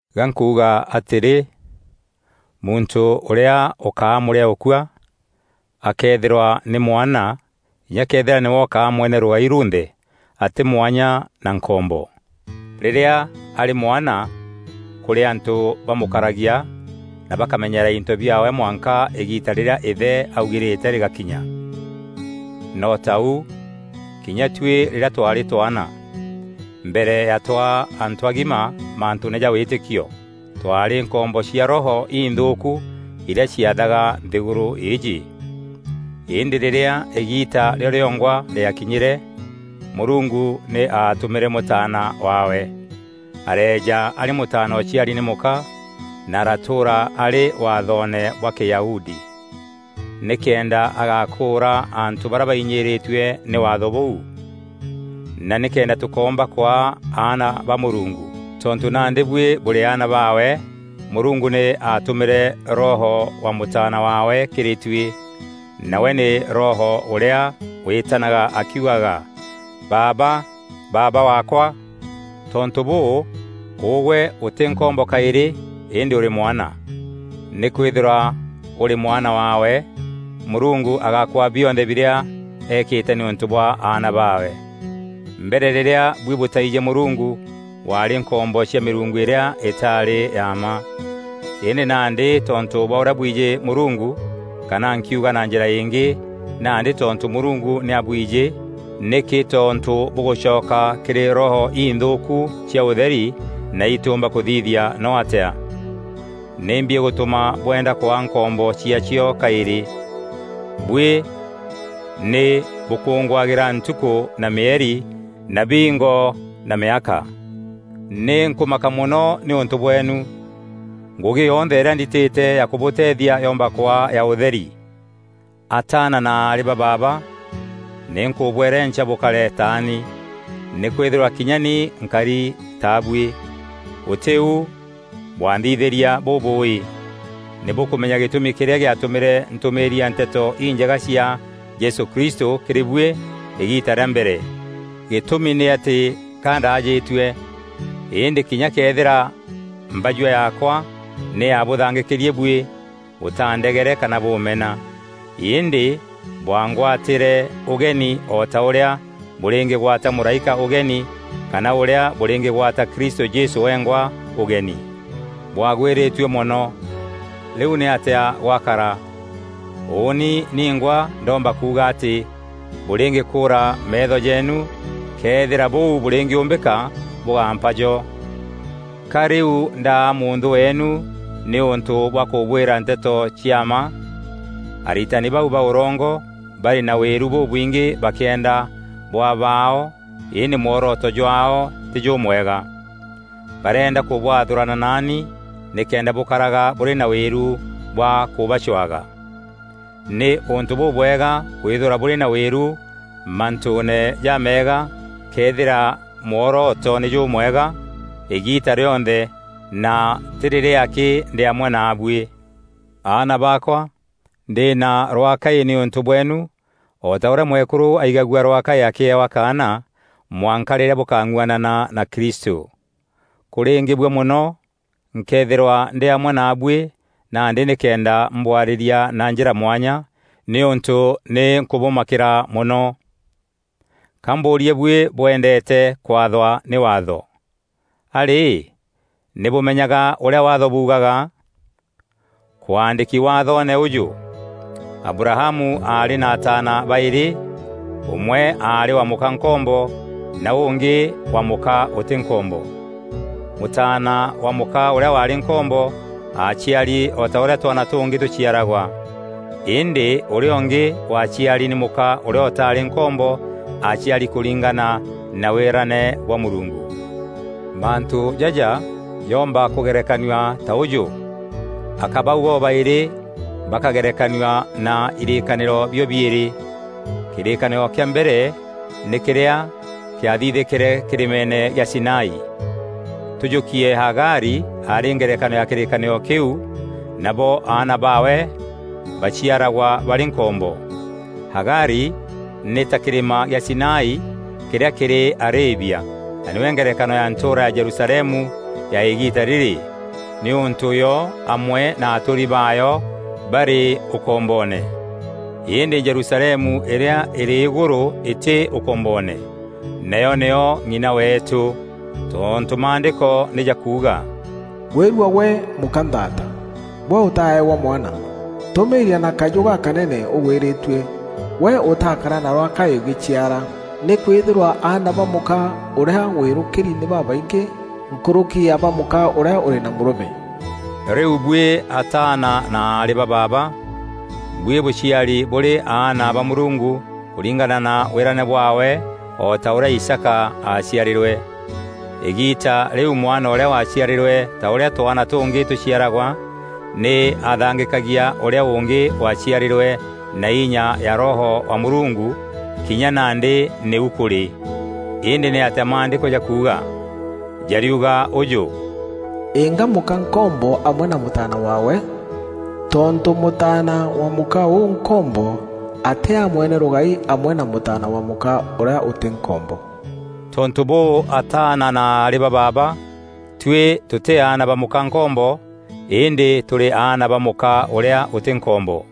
Ga nkuuga atîrî, muntû ûrîa ûkaa mûrîaûkua, akëethîrwa nî mwana kinya këethîra nîwe ûkaa mwene rûgai runthe atî mwanya na nkombo. Rîrîa arî mwana kûrî antû bamûkaragia na bakamenyeera into biaawe mwanka îgiita rîrîa îthe aaugîrîte rîgakinya. No ta ûu kinya tuî rîrîa twaarî twaana, mbere ya twaa antû agima mantûûne ja wîtîkio, twaarî nkombo cia roho inthûûku irîa ciathaga nthîgûrû îîjî. Îndî rîrîa îgiita rîo rîongwa rîakinyîre, Mûrungu nî aatûmîre Mûtaana waawe. Areeja arî mûtaana ûciari nî mûka, na aratûûra arî Waathoone bwa Kîyahudi, nîkenda agakûûra antû barîa bainyîîrîtue nî Waatho bûu, na nîkenda tûkoomba kwaa aana ba Mûrungu. Tontû nandî buî bûrî aana baawe, Mûrungu nî aatûmîre Roho wa Mûtaana waawe kîrî tuî, nawe nî Roho ûrîa wîtanaga akiugaga, “Baaba! Baaba Waakwa!” Tontû bûû, ûgwe ûtî nkombo kaîrî îndî ûrî mwana. Nîkwîthîrwa ûrî mwana waawe, Mûrungu agakwaa bionthe birîa eekîte nîûntû bwa aana baawe. Mbere rîrîa buî bûtaijî Mûrungu bwaarî nkombo cia mîrungu îrîa îtaarî ya mma. Îndî nandî tontû bwa ûrîa bwijî Mûrungu kana nkiuga na njîra îngî, nandî tontû Mûrungu nî abwijî nîkî tontû bûgûcoka kîrî roho inthûûku cia ûtheri na îtîûmba kûthithia no atîa? Nîmbi îgûtûma bwenda kwaa nkombo ciaacio kaîrî? Buî nî bûkûngûagîra ntukû na mîeri na biingo na mîaka. Nî nkûmaka mono nîûntû bweenu! Ngûgî yonthe îrîa nditîte ya kûbûteethia yomba kwaa ya ûtheri! Ataana na aarî ba baaba, nî nkûbwerenca bûkare taani. Nîkwîthîrwa kinya ni nkari ta buî. Gûtî u bwanthithîria bûbûûî. Nî bûkûmenya gîtûmi kîrîa gîatûmîre ntûmîîria Nteto Injega cia Jesû Kristû kîrî buî îgiita rîa mbere; gîtûmi nî atî ka ndaajîtue. Îndî kinya këethîra mbajua yaakwa nî yaabûthangîkîrie buî bûtaandegere kana bûmena. Îndî, bwangwatîre ûgeni o ta ûrîa bûrîngîgwata mûraîka ûgeni kana ûrîa bûrîngîgwata Kristû Jesû wengwa ûgeni. Bwaagwîrîtue mono! Rîu nîatîa gwakara? Ûûni ningwa ndomba kuuga atî bûrîngîkûûra meetho jeenu, këethîra bûu bûrîngîûmbîka, bûgampa jo. Ka rîu ndaa mûnthû weenu nîûntû bwa kûbwîra nteto cia mma? Aritani bau ba ûrongo barî na wîru bûbwingî bakîenda bwaa baao îndî mworoto jwaao tî jûmwega. Barîenda kûbwathûrana naani nîkenda bûkaraga bûrî na wîru bwa kûbacwaga. Nî ûntû bûbwega kwîthîrwa bûrî na wîru mantûûne jaameega këethîra mworoto nî jûmwega îgiita rîonthe na tî rîrîa akî ndî amwe naabuî. Aana baakwa, ndî na rwaakaî nîûntû bweenu o ta ûrîa mwekûrû aigagua rwaakaî akîewa kaana, mwanka rîrîa bûkang'uanana na Kristû. Kûrîngîbua mono nkëethîrwa ndî amwe naabuî nandî nîkenda mbwarîria na njîra mwanya, nîûntû nî nkûbûmakîra mono! Ka mbûûrie buî bwendeete kwathwa nî Waatho. A rî, nî bûmenyaga ûrîa Waatho buugaga? Kwaandîki Waathoone ûjû: Abrahamu aarî na ataana baîrî, ûmwe aarî wa mûka nkombo, na ûngî wa mûka ûtî nkombo. Mûtaana wa mûka ûrîa waarî nkombo, aaciari o ta ûrîa twaana tûngî tûciaragwa, îndî ûrîa ûngî waaciari nî mûka ûrîa ûtaarî nkombo, aaciari kûringana na wîrane bwa Mûrungu. Mantû jaja jomba kûgerekanua ta ûjû: aka bau bobaîrî bakagerekanua na irîîkanîîro bio-biîrî. Kîrîkanîro kîa mbere nî kîrîa kîathithîkîre kîrîmeene gîa Sinai. Tûjûkie Hagari arî ngerekano ya kîrîkanîro kîu, nabo aana baawe baciaragwa barî nkombo. Hagari, nî ta kîrîma gîa Sinai kîrîa kîrî Arabia na nîwe ngerekano ya ntûûra ya Jerusalemu ya îgiita rîrî, nîûntû yo amwe na atûûri baayo barî ûkomboone. Îndî Jerusalemu îrîa îrî îgûrû îtî ûkomboone, nayo nîyo ng'ina weetû. Tontû Maandîko nî jakuuga, “Gwîrua gwe mûka nthaata, gwe ûtaeewa mwana. Tûmîîria na kajû gakanene ûgwîrîtue, gwe ûtaakara na rwakaî ûgîciara. Nîkwîthîrwa aana ba mûka ûrîa wîrûkîri nî babaingî nkûrûki ya ba mûka ûrîa ûrî na mûrûme.” Rîu buî ataana na aarî ba baaba, buî bûciari bûrî aana ba Mûrungu kûringana na wîrane bwaawe o ta ûrîa Isaaka aaciarîrwe. Îgiita rîu mwana ûrîa waaciarîrwe ta ûrîa twaana tûngî tûciaragwa nî aathangîkagia ûrîa ûngî waaciarîrwe na inya ya Roho wa Mûrungu; kinya nandî nîu kûrî. Îndî nîatîa Maandîko jakuuga? Jariuga ûjû, “Inga mûka nkombo amwe na mûtaana waawe; tontû mûtaana wa mûka ûu nkombo atîaa mwene rûgai amwe na mûtaana wa mûka ûrîa ûtî nkombo.” Tontû bûû ataana na aarî ba baaba, tuî tûtî aana ba mûka nkombo, îndî tûrî aana ba mûka ûrîa ûtî nkombo.